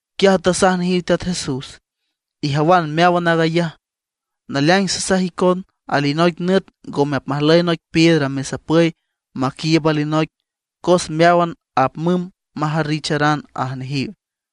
Quiaj tasaj nejiw Teat Jesús: ―¿Ijawan meáwan aag ayaj? Naleaing sasaj icon, alinoic nüt ngome apmajlüy noic piedra mesapüy maquiiüb alinoic, cos meáwan apmümb majarricharan ―aj nejiw.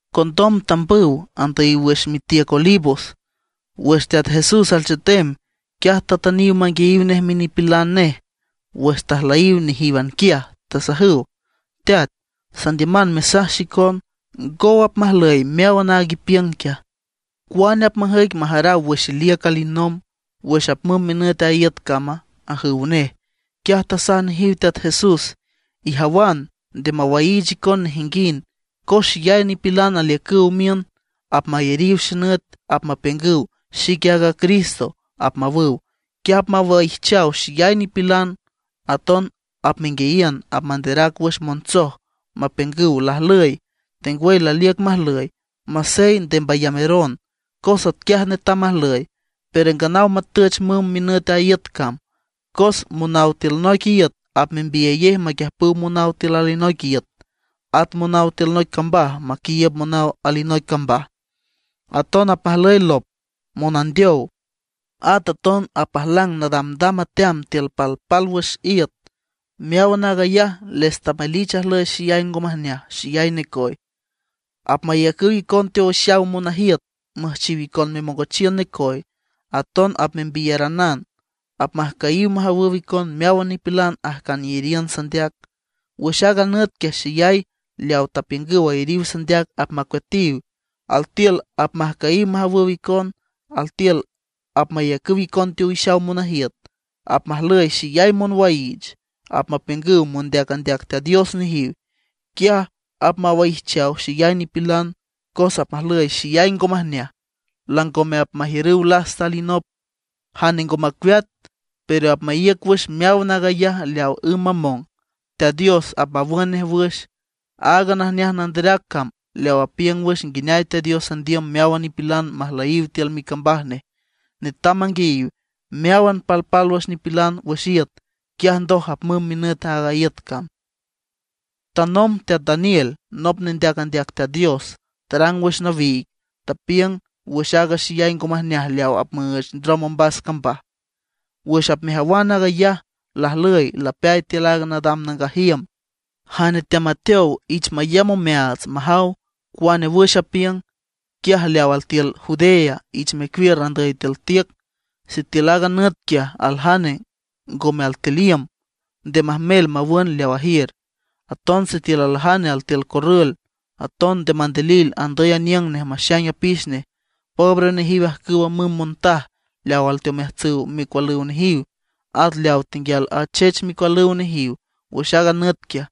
Condom tambüw andüyiw wüx mitiüc Olivos. Wüx Teat Jesús alchetem, quiaj tatüniw manguiayiw nej minipilan nej wüx tajlüyiw nejíwan quiaj, tasajüw: ―Teat, sandiüman mesaj xicon, ¿ngow apmajlüy meáwan aag ipiüng quiaja? ¿Cuane apmajüic majaraw wüx iliüc alinomb, wüx apmümb minüt a iüt cama? ―ajüw nej. Quiaj tasaj nejiw Teat Jesús: ―Ijawan, nde mawaiich icon nejinguind. Cos xeyay nipilan aliücüw miün, apmayariw xenüt, apmapiüngüw: “Xique aaga Cristo”, apmawüw; quiaj apmawaijchaw xeyay nipilan. Aton apmenguiayiün apmanderac wüx montsoj mapiüngüw lajlüy, tengwüy laliüc majlüy. Masey, nde mbayameron, cos atquiaj netam majlüy; pero nganaw matüch mümb minüt a iüt cam. Cos monaw tiül noic iüt apmembiyayej maquiüjpüw monaw tiül alinoic iüt, at monaw tiül noic cambaj maquiiüb monaw alinoic cambaj. Aton apmajlüy lop, monandeow, at aton apmajlang nadamdam ateam tiül palpálwüx iüt. Meáwan aag ayaj les tamelich ajlüy xeyay ngo majneaj, xeyay necoy. ’Apmayacüw icon teowixaw monajiüt müjchiw icon memongochiün necoy, aton apmembiyaranan. Apmajcüyiw majawüw icon meáwan nipilan ajcan iyariün sandeac. Wüx aaga nüt quiaj xeyay leaw tapiüngüw ayariw sandeac apmacueatiw. Altiül apmajcüyiw majawüw icon, altiül apmayacüw icon teowixaw monajiüt. Apmajlüy xeyay monwaiich. Apmapiüngüw mondeac andeac Teat Dios nejiw. Quiaj apmawaijchaw xeyay nipilan. Cos apmajlüy xeyay ngo majneaj, langome apmajiürüw lasta alinop. Jane ngo macueat, pero apmaíüc wüx meáwan aag ayaj leawa ümb mamong, Teat Dios apmawün nej wüx. Aaga najneaj nanderac cam leaw apiüng wüx nguineay Teat Dios andiüm meáwan nipilan majlüyiw tiül micambaj nej, netam manguiayiw meáwan palpálwüx nipilan wüx iüt. Quiaj ndoj apmümb minüt aaga iüt cam. ’Tanomb teat Daniel, nop nendeac andeac Teat Dios, tarang wüx nawiig, tapiüng wüx aaga xeyay ngo majneaj leaw apmüüch ndrom ombas cambaj. Wüx apmejawan aag ayaj lajlüy lapeay tiül aaga nadam nangaj iüm ―jane teamateow ich mayamb omeaats majaw cuane wüx apiüng. Quiaj leaw altiül Judea ich mecuiür andüy tiül tiüc. Sitiül aaga nüt quiaj aljane ngome altiül iüm, nde majmel mawün leaw ajiür. Aton sitiül aljane altiül corrül, aton nde mandilil andüy aniüng nej maxaing apix nej. ¡Pobre nejiw ajcüwa müm montaj leaw alteomeajtsüw micualüw nejiw, at leawa tenguial achech micualüw nejiw wüx aaga nüt quiaj!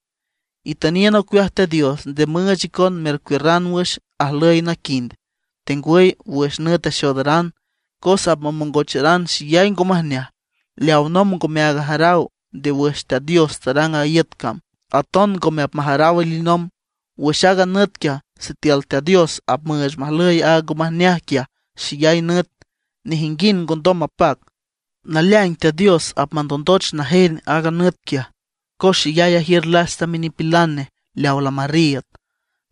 Itüniün ocueaj Teat Dios nde müüch icon mercuiürran wüx ajlüy naquind, tengwüy wüx nüt axoodaran. Cos apmamongocharan xeyay ngo majneaj, leaw nómban ngomeaag ajaraw nde wüx Teat Dios tarang aaga iüt, aton ngome apmajaraw alinomb. Wüx aaga nüt quiaj, sitiül Teat Dios apmüüch majlüy aaga ngo majneaj quiaj xeyay nüt, nejinguind ngondom mapac. Naleaing Teat Dios apmandondoch najen aag nüt quiaj, cos xeyay ajiür lasta minipilan nej leawa lamarriiüd.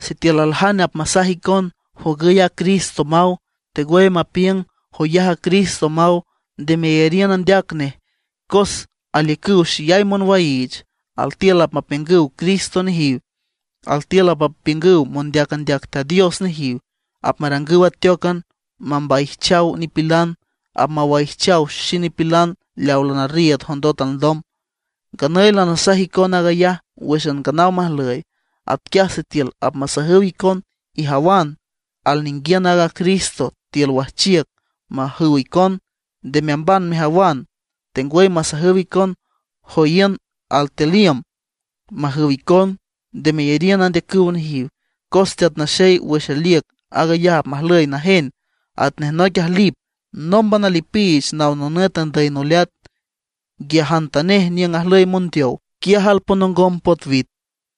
’Sitiül aljane apmasaj icon: “Jogüy a Cristo”, maw, tengwüy mapiüng: “Joyaj a Cristo”, maw, nde meyariün andeac nej. Cos aliücüw xeyay monwaiich, altiül apmapiüngüw Cristo nejiw, altiül apmapiüngüw mondeac andeac Teat Dios nejiw. Apmarangüw ateócan mambaijchaw nipilan, apmawaijchaw xenipilan leaw lanarriiüd jondot alndom. Nganüy lanasaj icon aag ayaj wǘxan nganaw majlüy. Atquiaj sitiül apmasajüw icon: “Ijawan, alninguiün aaga Cristo tiül wajchiüc”, majüw icon, nde meamban mejawan. Tengwüy apmasajüw icon: “Joíün altiül iüm”, majüw icon, nde meyariün andeacüw nejiw. Cos Teat Naxey, wüx aliüc aag ayaj apmajlüy najen, atnej noic ajlip nómban alipiich naw nonüt andüy noleat. Nquiajantanej niüng ajlüy mondeow, quiaj alponongom potwit.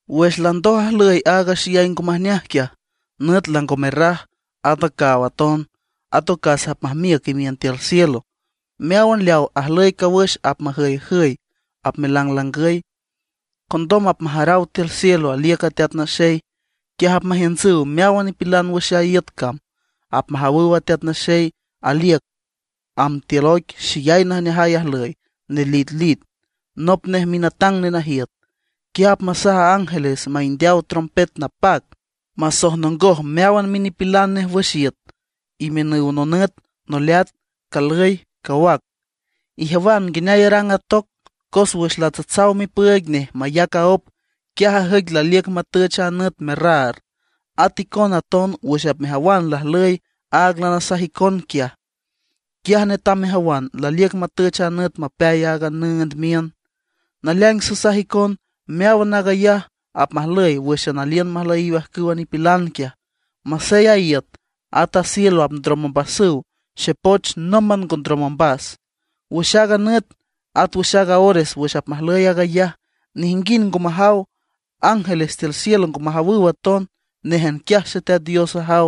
’Wüx landoj ajlüy aaga xeyay ngo majneaj quiaj, nüt lango merraj, at a caaw aton; at ocas apmajmiüc imiün tiül cielo. Meáwan leaw ajlüy cawüx apmajüyjüy apmelanglangüy. Condom apmajaraw tiül cielo aliüc a Teat Naxey. Quiaj apmajiüntsüw meáwan nipilan wüx a iüt cam; apmajawüw a Teat Naxey laliüc amb tiül oic xeyay najneajay ajlüy, nelitlit. Nop nej minatang nenajiüt. Quiaj apmasaj ángeles maindeaw trompet napac, masojnongoj meáwan minipilan nej wüx iüt, imiünüw nonüt, noleat, calüy, cawac. ’Ijawan nguineay arang a toc: Cos wüx latsatsaw mipüüig nej mayac aóp, quiaj ajüic laliüc matüch a nüt merraar. At icona aton wüx apmejawan lajlüy aag lanasaj icon quiaj, quiaj netam mejawan laliüc matüch a nüt mapeay aaga nüünd miün. Naleaing sasaj icon meáwan aag ayaj apmajlüy wǘxan aliün majlüyiw ajcüwa nipilan quiaj. Masey a iüt, at a cielo apndrom ombasüw, xepoch nómban ngo ndrom ombas. ’Wüx aaga nüt, at wüx aaga ores wüx apmajlüy aag ayaj, nejinguind ngo majaw. Ángeles tiül cielo ngo majawüw aton. Néjan quiaj Xeteat Dios ajaw.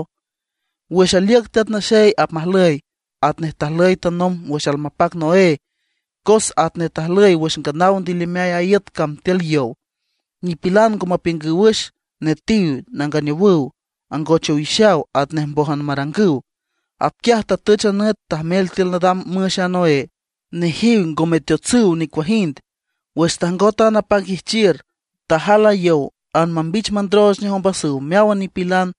’Wüx aliüc Teat Naxey, apmajlüy atnej tajlüy tanomb wüx almapac Noé. Cos atnej tajlüy wüx nganaw ndilimeay a iüt cam tiül yow, nipilan ngo mapiüngüw wüx, netiw, nanganeowüw, angoch owixaw atnej mbójan marangüw. Atquiaj tatüch a nüt majmel tiül nadam müx a Noé. Nejiw ngo meteotsüw nicuajind. Wüx tajngot a napac ijchiür, tajal a yow anmambich mandrooch nej ombasüw meáwan nipilan.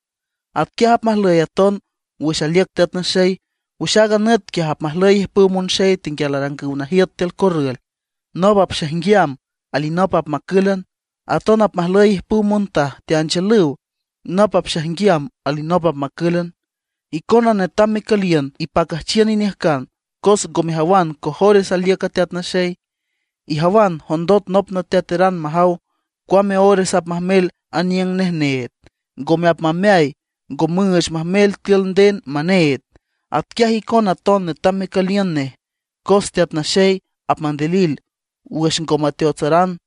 Atquiaj apmajlüy aton wüx aliüc Teat Naxey. Wüx aaga nüt quiaj apmajlüy ijpüw monxey tenguial arangüw najiüt tiül corrül. Nop apxaijnguiam, alinop apmacǘlan. Aton apmajlüy ijpüw montaj teanchiülüw, nop apxaijnguiam, alinop apmacǘlan. ’Icona netam mecüliün ipacüjchiün iniüjcan cos ngo mejawan cojores aliüc a Teat Naxey. Ijawan, jondot nop nateateran majaw cuame ores apmajmel aniüng nej need, ngome apmameay, ngo müüch majmel tiül nden maneed. Atquiaj icona aton netam mecüliün nej, cos Teat Naxey apmandilil wüx ngome teateotsaran.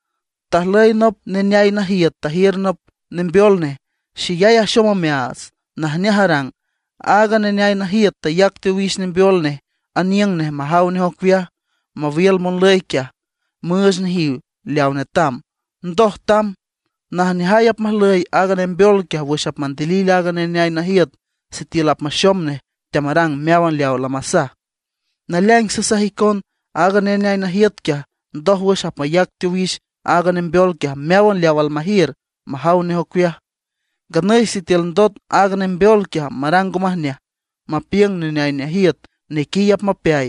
’Tajlüy nop neneay najiüt tajiür nop nembeol nej, xeyay axom omeaats, najneaj arang. Aaga neneay najiüt tayac teowix nembeol nej aniüng nej majaw nej ocueaj, mawiül monlüy quiaj, müüch nejiw leaw netam; ndoj tamb. Najneajay apmajlüy aaga nembeol quiaj wüx apmandilil aaga neneay najiüt sitiül apmaxom nej teamarang meáwan leaw lamasaj. Naleaing sasaj icon, aaga neneay najiüt quiaj ndójwüx apmayac teowix aaga nembeol quiaj meáwan leaw almajiür majaw nej ocueaj. Nganüy sitiül ndot aaga nembeol quiaj marang ngo majneaj, mapiüng neneay najiüt nequiy apmapeay;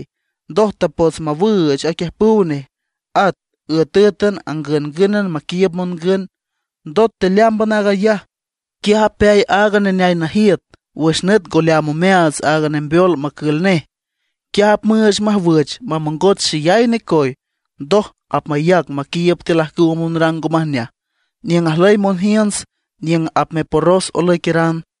ndoj tapots mawüüch aquiüjpüw nej, at üetǘetan, angüngǘnan maquiiüb mongün. Ndot tealeámban aag ayaj, quiaj apeay aaga neneay najiüt wüx nüt ngo leaam omeaats a nembeol macül nej. Quiaj apmüüch majwüch mamongoch xeyay necoy, ndoj apmayac maquiiüb tiül ajcüwa monrang ngo majneaj, niüng ajlüy monjiünts niüng apmeporros olüiqueran.